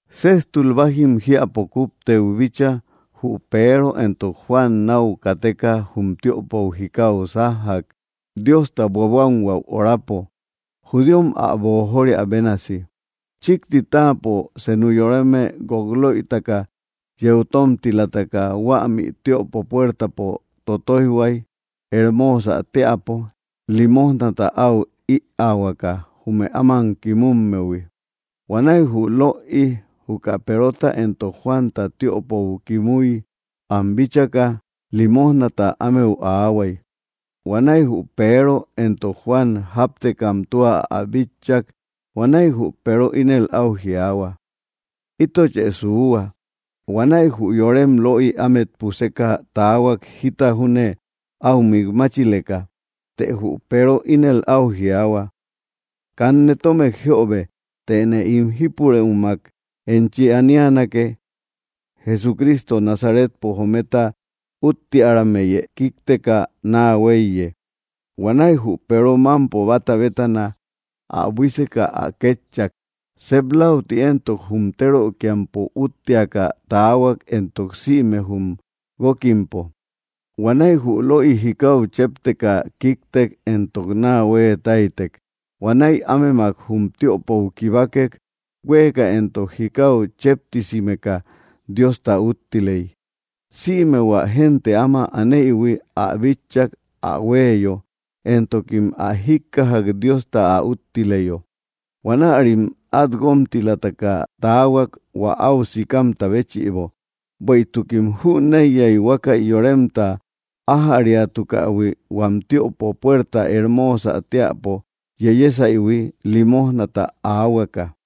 Séjtul bájim jiäpo kupteu bíchaa jü Peero éntok Juan nau kateka jum tiöpou jikáu sájjak Diostau buabuánhuäu orapo, judíom ä boojoria bénasi. Chikti táapo senu yoreme guok löitaka yeu tómtilataka huämi tiöpo puértaapo totóijhuai, Hermoosä teäpo, limojnata áu ïaahuaka, jume áman kimummehui. Huanäi jü löi juka Perota éntok Juanta tiöpou kimúi am bíchaka, limójnata ámeu aahuay. Huanäi jü Peero entok Juan jáptekam tua ä bitchak. Huanäi jü Peero ínel au jiaahua: —Ítochë suuhua. Huanäi jü yorem löi ámet puseka taahuak jita júne áu mik máchileka. Të jü Peero ínel au jiaahua: —Kanne tómek jiöbe, tëne ín jípurëumak enchi aníanake: Jesucristo Nazaretpo jometa úttearammeyë kíkteka naa huéiye. Huanäi jü Peero mampo bata bétana ä buíseka ä kétchak. Sep lauti éntok, jum térökiampo útteaka taahuak éntok sïme jum guókkimpo. Huanaí jü löi jikáu chépteka kíktek éntok naa huee táitek. Huanäi ámemak jum tiöpou kibákek. Huéeka éntok jikáu chéptisimeka, Diosta úttiley. Sïme hua génte áma anéïhui ä bitchak ä huéeyo, éntokim ä jíkkajak Diosta ä úttileyo. Huanärim at guómtilataka taahuak hua au sikamta béchïbo, bueïtukim jüneiyai huákäi yoremta ájäriatukähui huam tiöpo puerta Hermósä teäpo yeyésaïhui limójnata aáhuakä.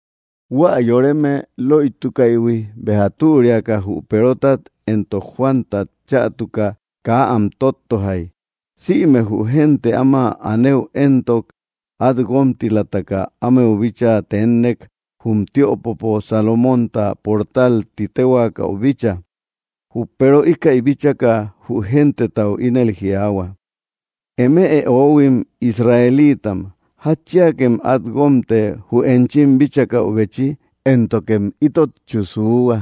Huä yoreme löitukaïhui béja türiaka jü Peerótat éntok Juántat chätuka kaa am tóttojai. Sïme jü génte áma anëu éntok, at guómtilataka ámeu bíchaa teénnek jum tiöpopo Salomonta portal titéhuaakäu bícha. Jü Peero íkäi bíchaka, jü gentetau ínel jiaahua: —Eme oóhuim Israeliitam, ¿jatchiakem át guómte jü enchim bíchakäubechi, éntokem ítotchu suuhua?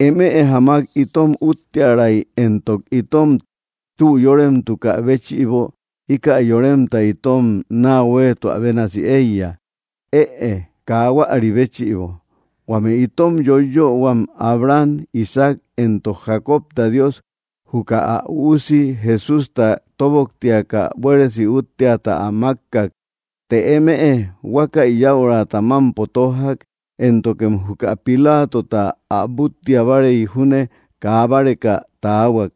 Eme jamak itom útterai éntok itom tü yórememtukä béchïbo íka yoremta itom naa hüeetua bénasi eiya. Ëe kaa huäri béchïbo. Huame itom yoiyöhuam Abraham, Isaac, éntok Jacobta Dios juka ä Üusi Jesústa tóboktiaka buéresi útteata ä mákkak. Të eme huákäi yäurata mámpo tójjak, éntokem juka Pilátota ä búttiabarei júne kaa báreka taahuak.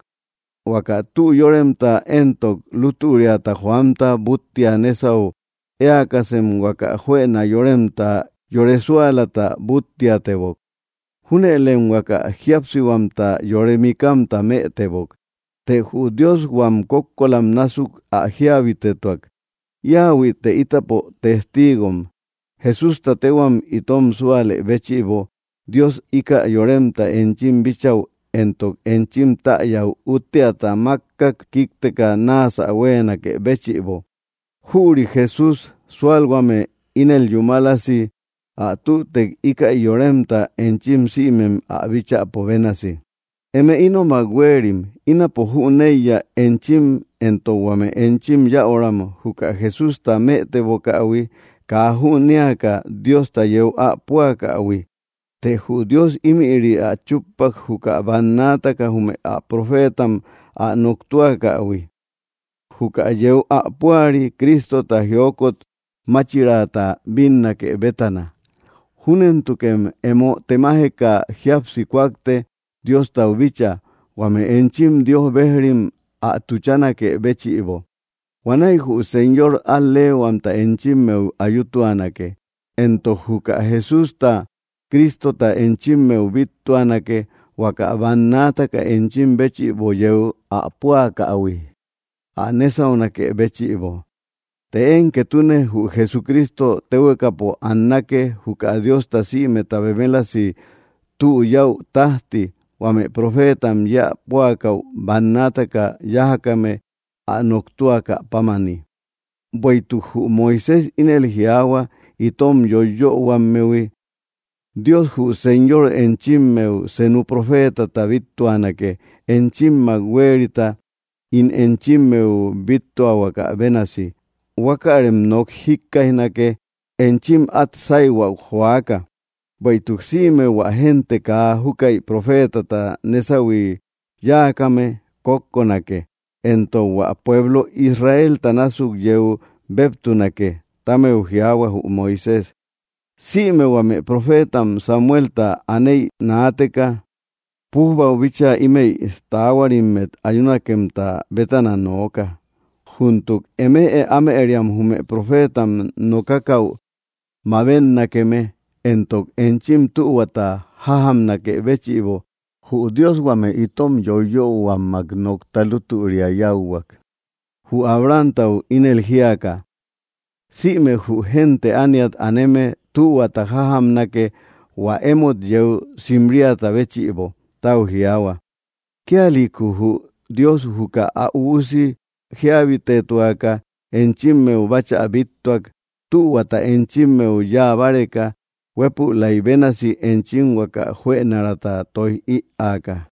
Huaka tü yóremta éntok lútüriata joamta búttia nésau éäkasem huaka juëna yóremta yore súalata búttiatebok. Júnëlem huaka jíapsihuamta yore mikamta mëtebok. Të jü Dios huam kókkolam násuk ä jíabitetuak. Íahuïte ítapo testíigom. Jesústa tehuam itom súalë béchïbo Dios ika yoremta enchim bíchäu éntok enchim täyäu útteata mákkak kíkteka náasä huéenakë béchïbo. Jüri Jesústa súalhuame ínel yúmalasi ä tütek íkäi yoremta, enchim sïmem ä bíchäpo bénasi. ’Eme ínomak huéerim, ínapo jüneiya eénchim éntok huame enchim yäuram juka Jesústa mëtebokähui kaa jünéaka Diosta yeu ä púakähui. Të jü Dios ímïri ä chúppak juka bannaataka jume ä profétam ä noktúakähui: juka yeu ä púari, Cristota, jiokot máchirata bínnake bétana. Júnentukem emo temajeka jíapsi kúakte Diostau bíchaa, huame enchim Dios bejrim ä tuchánakë béchïbo. Huanäi jü Señor al‑leehuamta enchimmeu ayutuanake, entok juka Jesústa, Cristota, enchimmeu bíttuanake, huaka bannaataka enchim béchïbo yeu ä púakähui ä nésaunakë béchïbo. Të én ketune jü Jesucristo téhuekapo annake juka Diosta sïmeta bemélasi tü yäu tajti, huame profétam yéä púakäu bannaataka yájakame ä noktúakäpámani. Bueïtuk jü Moisés ínel jiaahua itom yoiyöhuammehui: “Dios jü Señor enchimmeu senu profetata bíttuanake enchimmak huérita, ín enchimmeu bíttuahuakä bénasi. Huákärem nok jikkaijnake enchim at sáihuäu joaka, bueïtuk sïme hua génte kaa júkäi profetata nésauhui yáakame kókkonake, éntok hua pueblo Israelta násuk yeu béptunake”, ti ámeu jiaahua jü Moisés. ’Sïme huame profétam Samuelta anéi naateka pujbau bíchaa ímëi taáhuarimmet ayúnakemta bétana nooka. Júntuk eme ámëriam jume pofétam nokákäu mabénnakeme, éntok enchim tühuata jájamnakë béchïbo jü Dios huame itom yoiyöhuammak nokta lútüria yáuhuak, jü Abrahamtau ínel jíaka: “Sïme jü génte ániat aneme tühuata jájamnake hua émot yeu simríata béchïbo”, tau jiaahua. Kíalïku jü Dios juka ä Üusi jíabitetuaka enchimmeu báchä bíttuak, tühuata enchimmeu yáa báreka, huépülai bénasi enchim huaka juënaraata tóij ïaaka.